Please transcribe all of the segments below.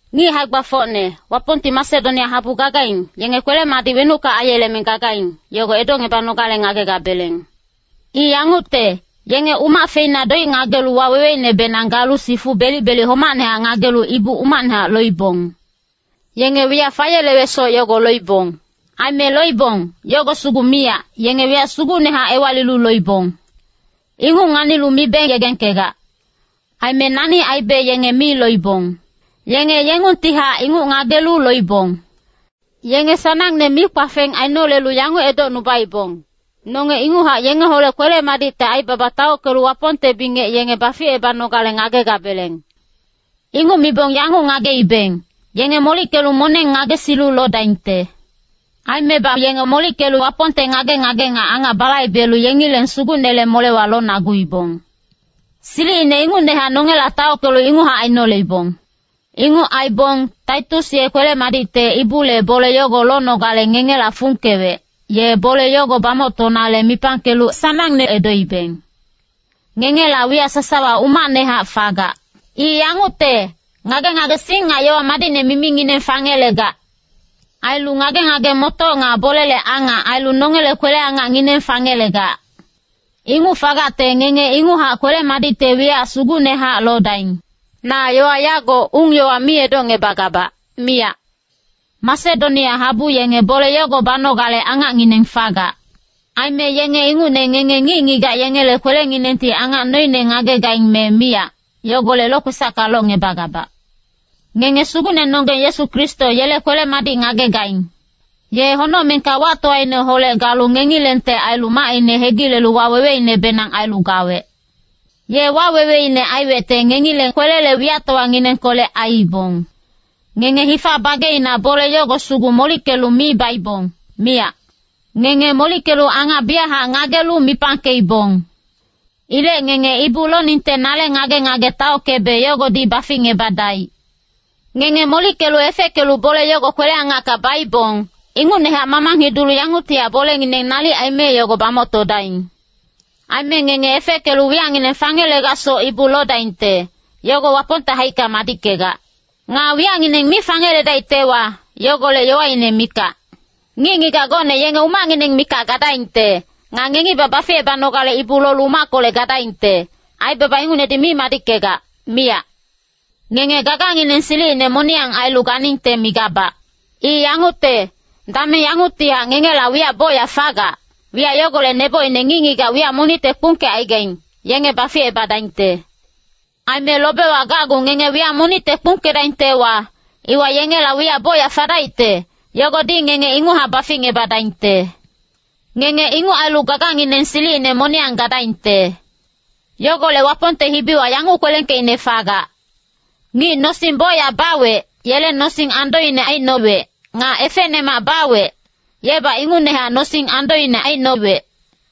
Ngic hae-gbafocne, Wapongti Masedonia habu gagaing, yenge kwele-madic wenucka aiyeleme gagaing, yogo edocngebanogale ngagegabeleng. I yangucte, yenge umac feina doic ngagelu waweweinebenang galu sifu belic-belic homacnehac ngagelu ibu umacnehac loibong. Yenge wiyac fayelewecsoc yogo loibong. Aime loibong, yogo sugu miyac, yenge wiyac sugucnehac ewalilu loibong. Inguc nganilu mibe yegengkegac. Aime nani aibe yenge mi loibong. Yenge yengungtihac inguc ngagelu loibong. Yenge sanangne mikpafeng ainolelu yanguc edocnubaibong, “Nonge inguchac yengeholec kwele-madicte aibaba taockelu Wapongte bingec yenge baficebanogale ngagegabeleng.” Inguc mibong yanguc ngageibeng, yenge molickelu moneng ngagesilu lodaingte. Aimebac yenge molickelu Wapongte ngage-ngage nga angac balaibelu yengileng Sugucnele molewa lonaguibong. Silicine ingucnehac nongela taockelu inguchac ainoleibong. Inguc aibong, Titus ye kwele-madicte ibule bole yogo lonogale ngengela fungkewec, ye bole yogo bamoctonale mipangkelu sanangne edoibeng. Ngengela wiyac sasawa umacnehac fagac. I yangucte, ngage-ngagesing nga yowa madicne mimingineng fangelegac. Ailu ngage-ngage-motoc nga bolele angac ailu nongele kwele-angacngineng fangelegac. Inguc fagacte ngenge inguchac kwele-madicte wiyac sugucnehac lodaing. Na yowa yago ung-yowa mi edocngebagabac, miyac. Masedonia habu yenge bole yogo banogale angacngineng fagac. Aime yenge ingucne ngenge ngic-ngigac yengele kwelenginengti angac noine ngagegaing me miyac, yogolec lokwesacka locngebagabac. Ngenge Sugucnenonggeng Yesu Kristo yele kwele-madic ngagegaing. Ye honocmengka wactowaineholec galu ngengilengte ailu macine hegilelu waweweinebenang ailu gawec. Ye waweweine aiwecte ngengileng kwelele wiyactowanginengkolec aiibong. Ngenge hifa bageina bole yogo sugu molickelu mi baibong, miyac. Ngenge molickelu angac biyachac ngagelu mipangkeibong. Ilec ngenge ibu loningte nale ngage-ngage taockebe yogodi baficngebadaic. Ngenge molickelu efeckelu bole yogo kwele-angacka baibong, ingucnehac mamang hidulu yanguctihac bolengineng nalic aime yogo bamoctodaing. Aime ngenge efeckelu wiyacngineng fangelegacsoc ibu lodaingte, yogo Wapongte haicka madickegac. Nga wiyacngineng mi fangeledaictewa, yogolec yowaine mikac. Ngic-ngigac gocne yenge umacngineng mikac gadaingte. Nga ngengibac baficebanogale ibu lolu umackolec gadaingte. Aibaba ingucnedi mi madickegac, miyac. Ngenge gagangineng silicine moniyang ailu ganingte migabac. I yangucte, dameng yanguctihac ngengela wiyac bocyac fagac, wiyac yogolec nebocine ngic-ngigac wiyac monicte kpungkecaigaing, yenge baficebadaingte. Aime lobewa gacgu ngenge wiyac monicte kpungkedaingtewa, iwa yengela wiyac bocyac fadaicte, yogodi ngenge inguchac baficngebadaingte. Ngenge inguc ailu gagangineng silicine moniyang gadaingte. Yogolec Wapongte hibiwa yanguc kwelengkeicne fagac, “Ngic nosing bocyac bawec, yele nosing andoine aicnowec. Nga efecnemac bawec, yebac ingucnehac nosing andoine aicnowec.”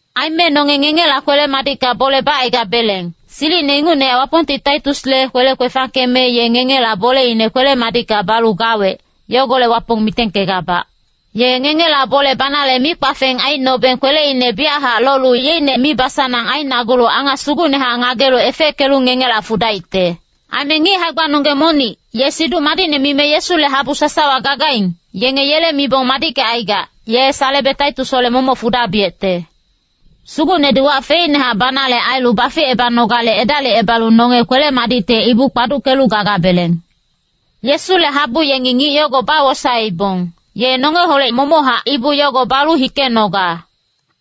Aime nonge ngengela kwele-madicka bole bacaigabeleng, silicine ingucnehac Wapongti Titusle kwele kwefangkeme ye ngengela boleine kwele-madicka balu gawec. Yogolec Wapong mitengkegabac. Ye ngengela bole banale mikpafeng aicnobeng kweleine biyachac lolu yeicne mibasanang ainagulu angac sugucnehac ngagelu efeckelu ngengela fudaicte. Aime ngic hae-gbanonggeng monic, ye Siduc Madicne mime Yesule habu sasawa gagaing, yenge yele mibong madickecaigac, ye salebeng Titusholec momoc fudabiyecte. Sugucnedi wac feicnehac banale ailu baficebanogale edalicebalu nonge kwele-madicte ibu kpaduckelu gagabeleng. Yesule habu yengi ngic yogo bawosaeibong, ye nongeholec momochac ibu yogo balu hikenoga.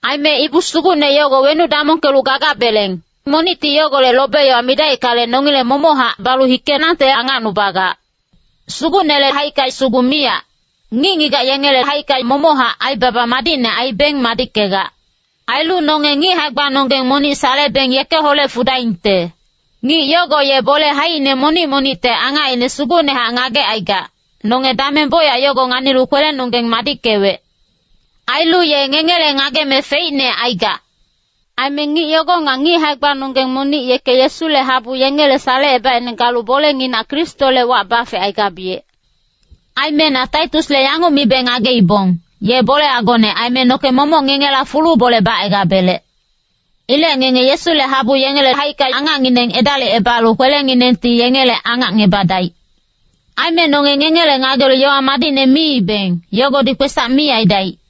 Aime ibu sugucne yogo wenuc damongkelu gagabeleng, monicti yogolec lobe-yowa midaickale, nongileng momochac balu hikenangte angacnubagac. Sugucnele haicka sugu miyac, ngic-ngigac yengele haicka momochac aibaba madicne aibeng madickegac. Ailu nonge ngic hae-gbanonggeng monic salebeng yekeholec fudaingte. Ngic yogo ye bole haicine monic-monicte angacine sugucnehac ngagecaigac, nonge dameng bocyac yogo nganilu kwelenonggeng madickewec. Ailu ye ngengele ngageme feicne aigac. Aime ngic yogo nga ngic hae-gbanonggeng monic yeke Yesule habu yengele salecebaicne galu bolenginac Kristole wac bafecaigabiyec. Aime na Titusle yanguc mibe ngageibong, ye bole agone aime noke momoc ngengela fulu bole bacaigabelec. Ilec ngenge Yesule habu yengele haicka angacngineng edalicebalu kwelenginengti yengele angacngebadaic. Aime nonge ngengele ngagelu yowa madicne miibeng, yogodi kwesac mi aidaic.